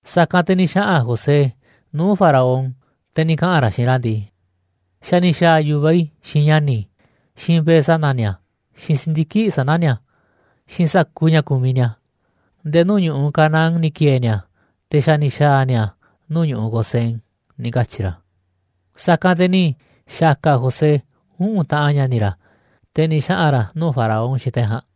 Sa̱kanꞌ te̱ ni̱ xaꞌa̱n José nuu̱ꞌ Faraón, te̱ ni̱ kaꞌa̱n ra̱ xiinꞌ ra̱ ndii: ―Xa̱ ni̱ xa̱a̱ yu̱vaꞌ i̱ xiinꞌ ña̱ni̱ i̱, xiinꞌ mbe̱e̱ sana̱ ni̱a̱, xiinꞌ si̱ndiki̱ꞌ sana̱ ni̱a̱, xiinꞌ sa̱kuuꞌ ña̱ kumiꞌ ni̱a̱. Nde̱e̱ nuu̱ꞌ ñu̱ꞌuꞌ Canaán ni̱ ki̱e̱e̱ ni̱a̱, te̱ xa̱ ni̱ xa̱a̱ ni̱a̱ nuu̱ꞌ ñu̱ꞌuꞌ Gosén ―ni̱ katyi̱ ra̱. Sa̱kanꞌ te̱ ni̱ xa̱ka̱ José uꞌu̱n taꞌan ña̱ni̱ ra̱, te̱ ni̱ xaꞌa̱n ra̱ nuu̱ꞌ Faraón xiinꞌ te̱ ja̱a̱nꞌ.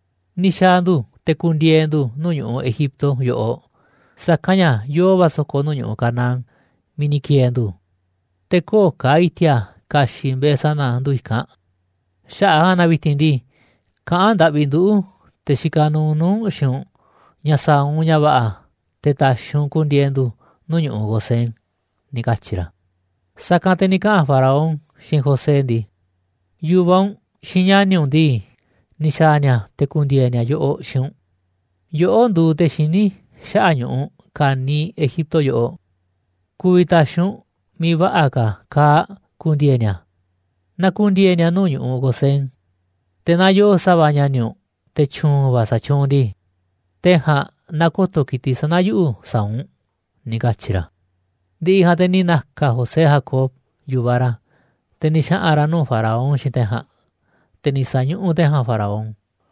Ni̱ xa̱a̱ ndu̱, te̱ ku̱ndi̱e̱e̱ nuuꞌ ndu̱ nuu̱ꞌ ñu̱ꞌuꞌ Egipto yoꞌoꞌ, sa̱kanꞌ ña̱ yoo va̱ so̱ko̱ nuu̱ꞌ ñu̱ꞌuꞌ Canaán miiꞌ ni̱ ki̱e̱e̱ ndu̱, te̱ köo̱ꞌ ka̱ i̱ti̱a̱ ka̱xi̱ꞌ mbe̱e̱ sana̱ ndu̱ i̱kanꞌ. Xaꞌa̱ꞌ a̱ ja̱a̱nꞌ na vi̱ti̱n ndii, kaꞌán ndaꞌvi nduꞌu̱, te̱ xikaꞌ nuuꞌ nuu̱ꞌ u̱nꞌ xiinꞌ u̱nꞌ ña̱ sa̱a̱ u̱nꞌ ña̱ va̱ꞌa̱ te̱ ta̱xi̱ u̱nꞌ ku̱ndi̱e̱e̱ ndu̱ nuu̱ꞌ ñu̱ꞌuꞌ Gosén ―ni̱ katyi̱ ra̱. Sa̱kanꞌ te̱ ni̱ kaꞌa̱n Faraón xiinꞌ José ndii: ―Yu̱vaꞌ u̱nꞌ, xiinꞌ ña̱ni̱ u̱nꞌ ndii, ni̱ xa̱a̱ ni̱a̱ te̱ ku̱ndi̱e̱e̱ ni̱a̱ yoꞌoꞌ xiinꞌ u̱nꞌ. Yoꞌó nduuꞌ te̱ xiní xaꞌa̱ꞌ ñu̱ꞌuꞌ ka̱niiꞌ Egipto yoꞌoꞌ, ku̱vi̱ ta̱xi̱ u̱nꞌ miiꞌ va̱ꞌa̱ ka̱ kaa̱ꞌ ku̱ndi̱e̱e̱ ni̱a̱, na ku̱ndi̱e̱e̱ ni̱a̱ nuu̱ꞌ ñu̱ꞌuꞌ Gosén. Te̱ naa yoo sa̱va̱ ña̱ni̱ u̱nꞌ, te̱ tyu̱u̱n va̱ sa̱tyuunꞌ ndii, te̱ ja̱a̱nꞌ na ko̱to̱ ki̱tiꞌ sana̱ yuꞌu̱ sa̱a̱ u̱nꞌ ―ni̱ katyi̱ ra̱. Ndi̱ꞌi̱ ja̱a̱nꞌ te̱ ni̱ na̱ka̱ José Jacob, yu̱vaꞌ ra̱, te̱ ni̱ xaꞌa̱n ra̱ nuu̱ꞌ Faraón xiinꞌ te̱ ja̱a̱nꞌ, te̱ ni̱ sa̱ñuꞌuꞌ te̱ ja̱a̱nꞌ Faraón.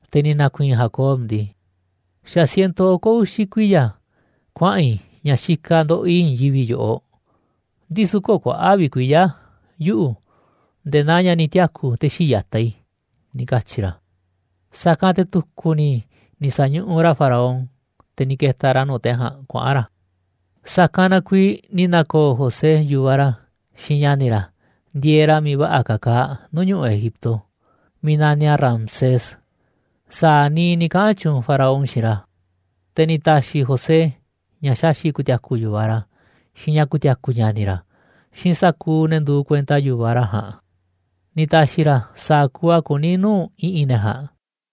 Te̱ ni̱ na̱ku̱i̱i̱n Jacob ndii: ―Xa̱ ciento oko̱ uxi̱ kuiya̱ kuaꞌa̱n i̱ ña̱ xikaꞌ ndoꞌoꞌ i̱ i̱i̱n yivi̱ꞌ yoꞌoꞌ, ndisu̱ köo̱ꞌ kuaꞌa̱ꞌ vi̱ꞌ kuiya̱ yuꞌu̱ nde̱e̱ naa ña̱ ni̱ tiaku̱ te̱ xii̱ꞌ ya̱taꞌ i̱ ―ni̱ katyi̱ ra̱. Sa̱kanꞌ te̱ tu̱ku̱ ni̱ ni̱ sa̱ñuꞌuꞌ ra̱ Faraón, te̱ ni̱ ke̱ta̱ ra̱ nuu̱ꞌ te̱ ja̱a̱nꞌ kuaꞌa̱n ra̱. Sa̱kanꞌ na kuiiꞌ ni̱ na̱ko̱o̱ José yu̱vaꞌ ra̱ xiinꞌ ña̱ni̱ ra̱ ndieeꞌ ra̱ miiꞌ va̱ꞌa̱ ka̱ ka̱a̱ nuu̱ꞌ ñu̱ꞌuꞌ Egipto, miiꞌ naniꞌ a̱ Ramsés, sa̱a̱ niiꞌ ni̱ kaꞌa̱n tyuunꞌ Faraón xiinꞌ ra̱. Te̱ ni̱ ta̱xi̱ José ña̱ xaxi̱ꞌ ku̱ti̱a̱ku̱ yu̱vaꞌ ra̱, xiinꞌ ña̱ ku̱ti̱a̱ku̱ ña̱ni̱ ra̱, xiinꞌ sa̱kuuꞌ ne̱ nduuꞌ kuenta yu̱vaꞌ ra̱ ja̱a̱nꞌ, ni̱ ta̱xi̱ ra̱ sa̱a̱ kuuꞌ a̱ kuní nuu̱ꞌ i̱ꞌi̱n ne̱ ja̱a̱nꞌ.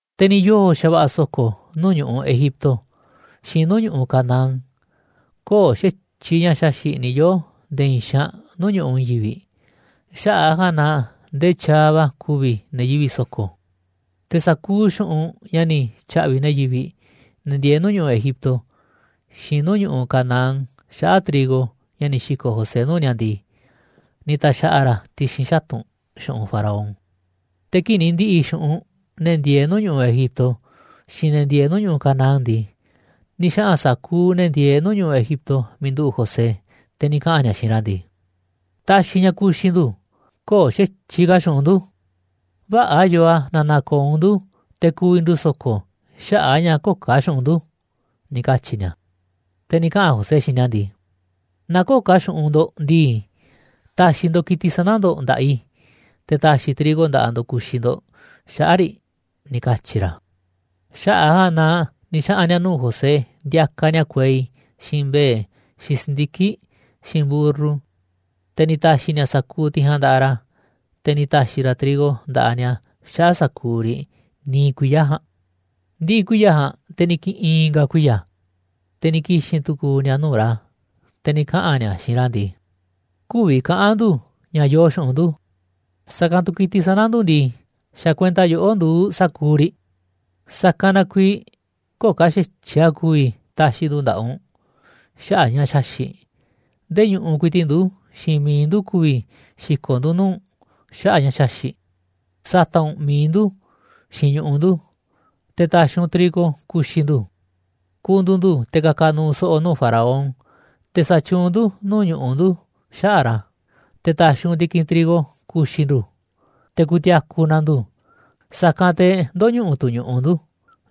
Te̱ ni̱ yoo̱ xa̱va̱ꞌa̱ so̱ko̱ nuu̱ꞌ ñu̱ꞌuꞌ Egipto, xiinꞌ nuu̱ꞌ ñu̱ꞌuꞌ Canaán, köo̱ꞌ xa̱tyiꞌ ña̱ xaxi̱ꞌ ni̱ yoo̱ nde̱e̱ i̱i̱n xaanꞌ nuu̱ꞌ ñu̱ꞌuꞌ i̱i̱n yivi̱ꞌ, xaꞌa̱ꞌ a̱ ja̱a̱nꞌ na ndee tyaaꞌ va̱ ku̱vi̱ ne̱ yivi̱ꞌ so̱ko̱. Te̱ sa̱kuuꞌ xu̱ꞌunꞌ ña̱ ni̱ tya̱ꞌvi̱ ne̱ yivi̱ꞌ, ne̱ ndieeꞌ nuu̱ꞌ ñu̱ꞌuꞌ Egipto, xiinꞌ nuu̱ꞌ ñu̱ꞌuꞌ Canaán xaꞌa̱ꞌ trigo ña̱ ni̱ xi̱ko̱ꞌ José nuu̱ꞌ ni̱a̱ ndii, ni̱ ta̱xa̱ꞌa̱ ra̱ a̱ ti̱xi̱n xatu̱nꞌ xu̱ꞌunꞌ Faraón. Te̱ kii̱ꞌ ni̱ ndi̱ꞌi̱ xu̱ꞌunꞌ ne̱ ndieeꞌ nuu̱ꞌ ñu̱ꞌuꞌ Egipto, xiinꞌ ne̱ ndieeꞌ nuu̱ꞌ ñu̱ꞌuꞌ Canaán ndii, ni̱ xaꞌa̱n sa̱kuuꞌ ne̱ ndieeꞌ nuu̱ꞌ ñu̱ꞌuꞌ Egipto miiꞌ nduꞌu̱ꞌ José, te̱ ni̱ kaꞌa̱n ni̱a̱ xiinꞌ ra̱ ndii: ―Ta̱xi̱ ña̱ ku̱xi̱ ndu̱, köo̱ꞌ xa̱tyiꞌ ka̱ xu̱ꞌunꞌ ndu̱, vä̱ꞌa̱ yoo a̱ naaꞌ na̱ko̱o̱ u̱nꞌ ndu̱ te̱ ku̱vi̱ ndu̱ so̱ko̱ xaꞌa̱ꞌ a̱ ña̱ köo̱ꞌ ka̱ xu̱ꞌunꞌ ndu̱ ―ni̱ katyi̱ ni̱a̱. Te̱ ni̱ kaꞌa̱n José xiinꞌ ni̱a̱ ndii: ―Naaꞌ köo̱ꞌ ka̱ xu̱ꞌunꞌ ndo̱ꞌ ndii, ta̱xi̱ ndo̱ꞌ ki̱tiꞌ sana̱ ndo̱ꞌ nda̱ꞌaꞌ i̱, te̱ ta̱xi̱ i̱ trigo nda̱ꞌaꞌ ndo̱ꞌ ku̱xi̱ ndo̱ꞌ xaꞌa̱ꞌ riꞌ ―ni̱ katyi̱ ra̱. Xaꞌa̱ꞌ a̱ ja̱a̱nꞌ na ni̱ xaꞌa̱n ni̱a̱ nuu̱ꞌ José ndiakaꞌ ni̱a̱ kuei, xiinꞌ mbe̱e̱, xiinꞌ si̱ndiki̱ꞌ, xiinꞌ mburru, te̱ ni̱ ta̱xi̱ ni̱a̱ sa̱kuuꞌ tiꞌ ja̱a̱nꞌ nda̱ꞌaꞌ ra̱, te̱ ni̱ ta̱xi̱ ra̱ trigo nda̱ꞌaꞌ ni̱a̱ xaꞌa̱ꞌ sa̱kuuꞌ riꞌ niiꞌ kuiya̱ ja̱a̱nꞌ. Ndi̱ꞌi̱ kuiya̱ ja̱a̱nꞌ, te̱ ni̱ ki̱ꞌi̱n i̱nga̱ kuiya̱, te̱ ni̱ ki̱xi̱n tu̱ku̱u̱ ni̱a̱ nuu̱ꞌ ra̱, te̱ ni̱ kaꞌa̱n ni̱a̱ xiinꞌ ra̱ ndii: ―Kü̱vi̱ kaꞌa̱n ndu̱ ña̱ yoo xu̱ꞌunꞌ ndu̱, sa̱kanꞌ tu̱ ki̱tiꞌ sana̱ ndu̱ ndii, xa̱ kuenta yoꞌó nduuꞌ sa̱kuuꞌ riꞌ. Sa̱kanꞌ na kuiiꞌ köo̱ꞌ ka̱ xa̱tyiꞌ a̱ ku̱vi̱ ta̱xi̱ ndu̱ nda̱ꞌaꞌ u̱nꞌ xaꞌa̱ꞌ ña̱ xaxi̱ꞌ, ndee ñu̱ꞌuꞌ ku̱i̱ti̱ꞌ ndu̱, xiinꞌ mi̱iꞌ ndu̱ ku̱vi̱ xi̱ko̱ꞌ ndu̱ nuu̱ꞌ u̱nꞌ xaꞌa̱ꞌ ña̱ xaxi̱ꞌ. Sa̱ta̱ꞌ u̱nꞌ mi̱iꞌ ndu̱, xiinꞌ ñu̱ꞌuꞌ ndu̱, te̱ ta̱xi̱ u̱nꞌ trigo ku̱xi̱ ndu̱. Ku̱ndu̱u̱ ndu̱ te̱ ka̱ka̱ nuuꞌ so̱ꞌo̱ nuu̱ꞌ Faraón, te̱ sa̱tyuunꞌ ndu̱ nuu̱ꞌ ñu̱ꞌuꞌ ndu̱ xaꞌa̱ꞌ ra̱, te̱ ta̱xi̱ u̱nꞌ ndi̱kinꞌ trigo ku̱xi̱ ndu̱, te̱ ku̱ti̱a̱ku̱ na ndu̱, sa̱kanꞌ te̱ ndö̱ñuꞌuꞌ tu̱ ñu̱ꞌuꞌ ndu̱.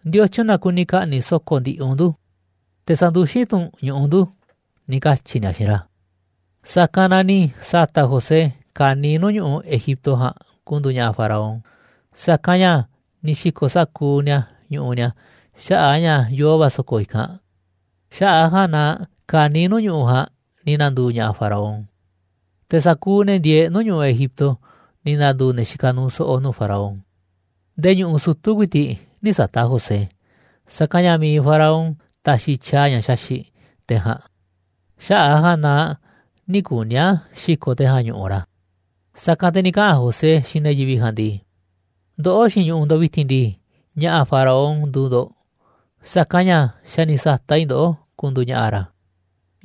¿Ndiotyun na kuni ka̱ꞌni̱ꞌ so̱ko̱ ndiꞌiꞌ u̱nꞌ ndu̱, te̱ sa̱nduxín tu̱ u̱nꞌ ñu̱ꞌuꞌ ndu̱? ―ni̱ katyi̱ ni̱a̱ xiinꞌ ra̱. Sa̱kanꞌ na ni̱ sa̱ta̱ꞌ José ka̱niiꞌ nuu̱ꞌ ñu̱ꞌuꞌ Egipto ja̱a̱nꞌ ku̱ndu̱u̱ ña̱ꞌa̱ Faraón, sa̱kanꞌ ña̱ ni̱ xi̱ko̱ sa̱kuuꞌ ni̱a̱ ñu̱ꞌuꞌ ni̱a̱ xaꞌa̱ꞌ a̱ ña̱ yoo va̱ so̱ko̱ i̱kanꞌ. Xaꞌa̱ꞌ a̱ ja̱a̱nꞌ na ka̱niiꞌ nuu̱ꞌ ñu̱ꞌuꞌ ja̱a̱nꞌ ni̱ na̱ndu̱u̱ ña̱ꞌa̱ Faraón. Te̱ sa̱kuuꞌ ne̱ ndieeꞌ nuu̱ꞌ ñu̱ꞌuꞌ Egipto ni̱ na̱ndu̱u̱ ne̱ xikaꞌ nuuꞌ so̱ꞌo̱ nuu̱ꞌ Faraón. Ndee ñu̱ꞌuꞌ sutu̱ ku̱i̱ti̱ꞌ nï̱ sata̱ꞌ José, sa̱kanꞌ ña̱ mi̱iꞌ Faraón taxiꞌ tyaaꞌ ña̱ xaxi̱ꞌ te̱ ja̱a̱nꞌ, xaꞌa̱ꞌ a̱ ja̱a̱nꞌ na nï̱ kuni̱ a̱ xi̱ko̱ te̱ ja̱a̱nꞌ ñu̱ꞌuꞌ ra̱. Sa̱kanꞌ te̱ ni̱ kaꞌa̱n José xiinꞌ ne̱ yivi̱ꞌ ja̱a̱nꞌ ndii: ―Ndoꞌó xiinꞌ ñu̱ꞌuꞌ ndo̱ꞌ vi̱ti̱n ndii, ña̱ꞌa̱ Faraón nduuꞌ ndo̱ꞌ, sa̱kanꞌ ña̱ xa̱ ni̱ sa̱ta̱ꞌ i̱ ndoꞌó ku̱ndu̱u̱ ña̱ꞌa̱ ra̱,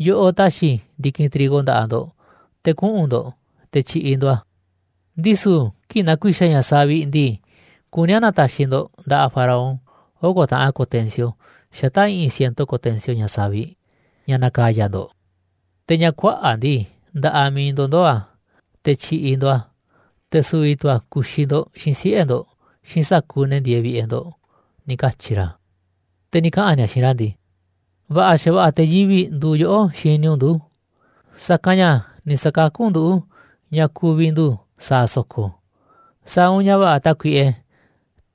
yoꞌoꞌ taxiꞌ i̱ ndi̱kinꞌ trigo nda̱ꞌaꞌ ndo̱ꞌ, te̱ kuꞌu̱n ndo̱ꞌ te̱ tyi̱ꞌi̱ ndo̱ꞌ a̱, ndisu̱ kii̱ꞌ na̱ku̱i̱xa̱ ña̱ savi̱ꞌ ndii, kuní a̱ na̱ta̱xi̱ ndo̱ꞌ nda̱ꞌaꞌ Faraón oko̱ taꞌan ko̱tensio xata̱ꞌ i̱ꞌi̱n ciento ko̱tensio ña̱ savi̱ꞌ, ña̱ na̱ka̱ya̱ ndo̱ꞌ, te̱ ña̱ kuaꞌa̱ꞌ ndii, nda̱ꞌaꞌ miiꞌ ndo̱ꞌ ndoo̱ a̱, te̱ tyi̱ꞌi̱ ndo̱ꞌ a̱, te̱ su̱vi̱ tu̱ a̱ ku̱xi̱ ndo̱ꞌ xiinꞌ siꞌe̱ ndo̱ꞌ, xiinꞌ sa̱kuuꞌ ne̱ ndieeꞌ vi̱ꞌe̱ ndo̱ꞌ ―ni̱ katyi̱ ra̱. Te̱ ni̱ kaꞌa̱n ni̱a̱ xiinꞌ ra̱ ndii: ―Va̱ꞌa̱ xa̱va̱ꞌa̱ te̱ yivi̱ꞌ nduuꞌ yoꞌó xini u̱nꞌ ndu̱, sa̱kanꞌ ña̱ ni̱ sa̱kakú u̱nꞌ nduꞌu̱ ña̱ ku̱vi̱ ndu̱ sa̱a̱ so̱ko̱. Sa̱a̱ u̱nꞌ ña̱ va̱ꞌa̱, tákuiꞌe,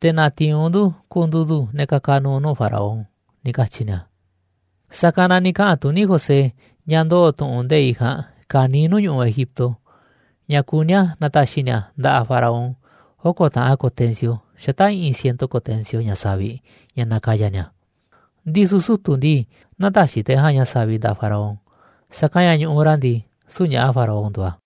te̱ na̱ti̱i̱n u̱nꞌ ndu̱ ku̱ndu̱u̱ ndu̱ ne̱ ka̱ka̱ nu̱u̱ nuu̱ꞌ Faraón ―ni̱ katyi̱ ni̱a̱. Sa̱kanꞌ na ni̱ kaꞌa̱n tuní José ña̱ ndoo̱ tu̱ꞌu̱n nde̱iꞌ ja̱a̱nꞌ ka̱niiꞌ nuu̱ꞌ ñu̱ꞌuꞌ Egipto, ña̱ kuní a̱ na̱ta̱xi̱ ni̱a̱ nda̱ꞌaꞌ Faraón oko̱ taꞌan ko̱tensio xata̱ꞌ i̱ꞌi̱n ciento ko̱tensio ña̱ savi̱ꞌ, ña̱ na̱ka̱ya̱ ni̱a̱. Ndisu̱ sutu̱ ndii, nä̱ta̱xi̱ te̱ ja̱a̱nꞌ ña̱ savi̱ꞌ nda̱ꞌaꞌ Faraón, sa̱kanꞌ ña̱ ñu̱ꞌuꞌ ra̱ ndii, süu̱ꞌ ña̱ꞌa̱ Faraón nduuꞌ a̱.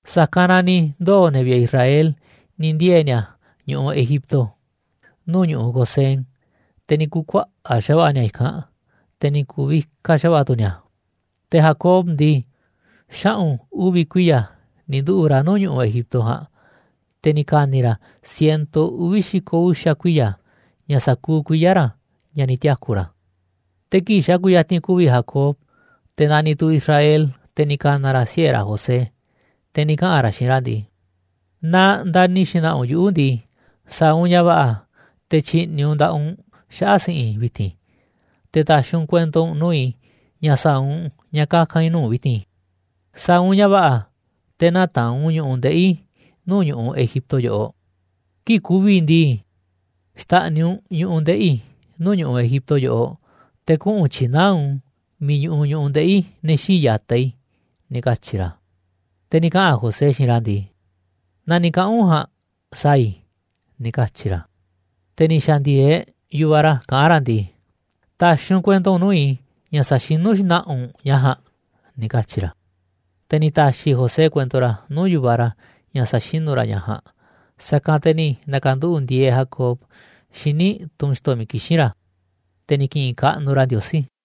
Sa̱kanꞌ na ni̱ ndoo̱ ne̱ vi̱ꞌe̱ Israel ni̱ ndiee̱ ni̱a̱ ñu̱ꞌuꞌ Egipto, nuu̱ꞌ ñu̱ꞌuꞌ Gosén, te̱ ni̱ ku̱kuaꞌa̱ꞌ xa̱va̱ꞌa̱ ni̱a̱ i̱kanꞌ, te̱ ni̱ ku̱vikaꞌ xa̱va̱ꞌa̱ tu̱ ni̱a̱. Te̱ Jacob ndii, xaꞌu̱n uvi̱ kuiya̱ ni̱ nduꞌu̱ꞌ ra̱ nuu̱ꞌ ñu̱ꞌuꞌ Egipto ja̱a̱nꞌ, te̱ ni̱ ka̱ni̱ ra̱ ciento uvi̱ xi̱ko̱ uxa̱ kuiya̱, ña̱ sa̱kuuꞌ kuiya̱ ra̱ ña̱ ni̱ tiaku̱ ra̱. Te̱ kii̱ꞌ xa̱ kuyatinꞌ ku̱vi̱ Jacob, te̱ naniꞌ tu̱ Israel, te̱ ni̱ ka̱na̱ ra̱ siꞌe̱ ra̱ José, te̱ ni̱ kaꞌa̱n ra̱ xiinꞌ ra̱ ndii: ―Naaꞌ ndani̱ xna̱ꞌa̱ u̱nꞌ yuꞌu̱ ndii, sa̱a̱ u̱nꞌ ña̱ va̱ꞌa̱, te̱ tyi̱ꞌni̱ u̱nꞌ nda̱ꞌaꞌ u̱nꞌ xaꞌa̱ꞌ si̱ꞌi̱n i̱ vi̱ti̱n, te̱ ta̱xi̱ u̱nꞌ kuento u̱nꞌ nuu̱ꞌ i̱ ña̱ sa̱a̱ u̱nꞌ ña̱ kaka̱n i̱ nuu̱ꞌ u̱nꞌ vi̱ti̱n. Sa̱a̱ u̱nꞌ ña̱ va̱ꞌa̱, te̱ nä̱taa̱nꞌ u̱nꞌ ñu̱ꞌuꞌ ndeꞌi̱ i̱ nuu̱ꞌ ñu̱ꞌuꞌ Egipto yoꞌoꞌ. Kii̱ꞌ ku̱vi̱ i̱ ndii, xta̱ꞌniꞌ u̱nꞌ ñu̱ꞌuꞌ ndeꞌi̱ i̱ nuu̱ꞌ ñu̱ꞌuꞌ Egipto yoꞌoꞌ, te̱ kuꞌu̱n tyi̱naá u̱nꞌ u̱n miiꞌ ñuꞌuꞌ ñu̱ꞌuꞌ ndeꞌi̱ ne̱ xii̱ꞌ ya̱taꞌ i̱ ―ni̱ katyi̱ ra̱. Te̱ ni̱ kaꞌa̱n José xiinꞌ ra̱ ndii: ―Naa ni̱ kaꞌa̱n u̱nꞌ ja̱a̱nꞌ sa̱a̱ i̱ ―ni̱ katyi̱ ra̱. Te̱ ni̱ xa̱ndi̱e̱eꞌ yu̱vaꞌ ra̱ kaꞌán ra̱ ndii: ―Ta̱xi̱ u̱nꞌ kuento u̱nꞌ nuu̱ꞌ i̱ ña̱ sa̱xinu̱ xna̱ꞌa̱ u̱nꞌ u̱n ña̱ ja̱a̱nꞌ ―ni̱ katyi̱ ra̱. Te̱ ni̱ ta̱xi̱ José kuento ra̱ nuu̱ꞌ yu̱vaꞌ ra̱ ña̱ sa̱xinu̱ ra̱ ña̱ ja̱a̱nꞌ. Sa̱kanꞌ te̱ ni̱ na̱ka̱nduꞌu̱ꞌ ndieeꞌ Jacob xíniꞌ tunꞌ xi̱to̱ miiꞌ kixín ra̱, te̱ ni̱ ki̱ꞌi̱n kaꞌnuꞌ ra̱ Ndiosí.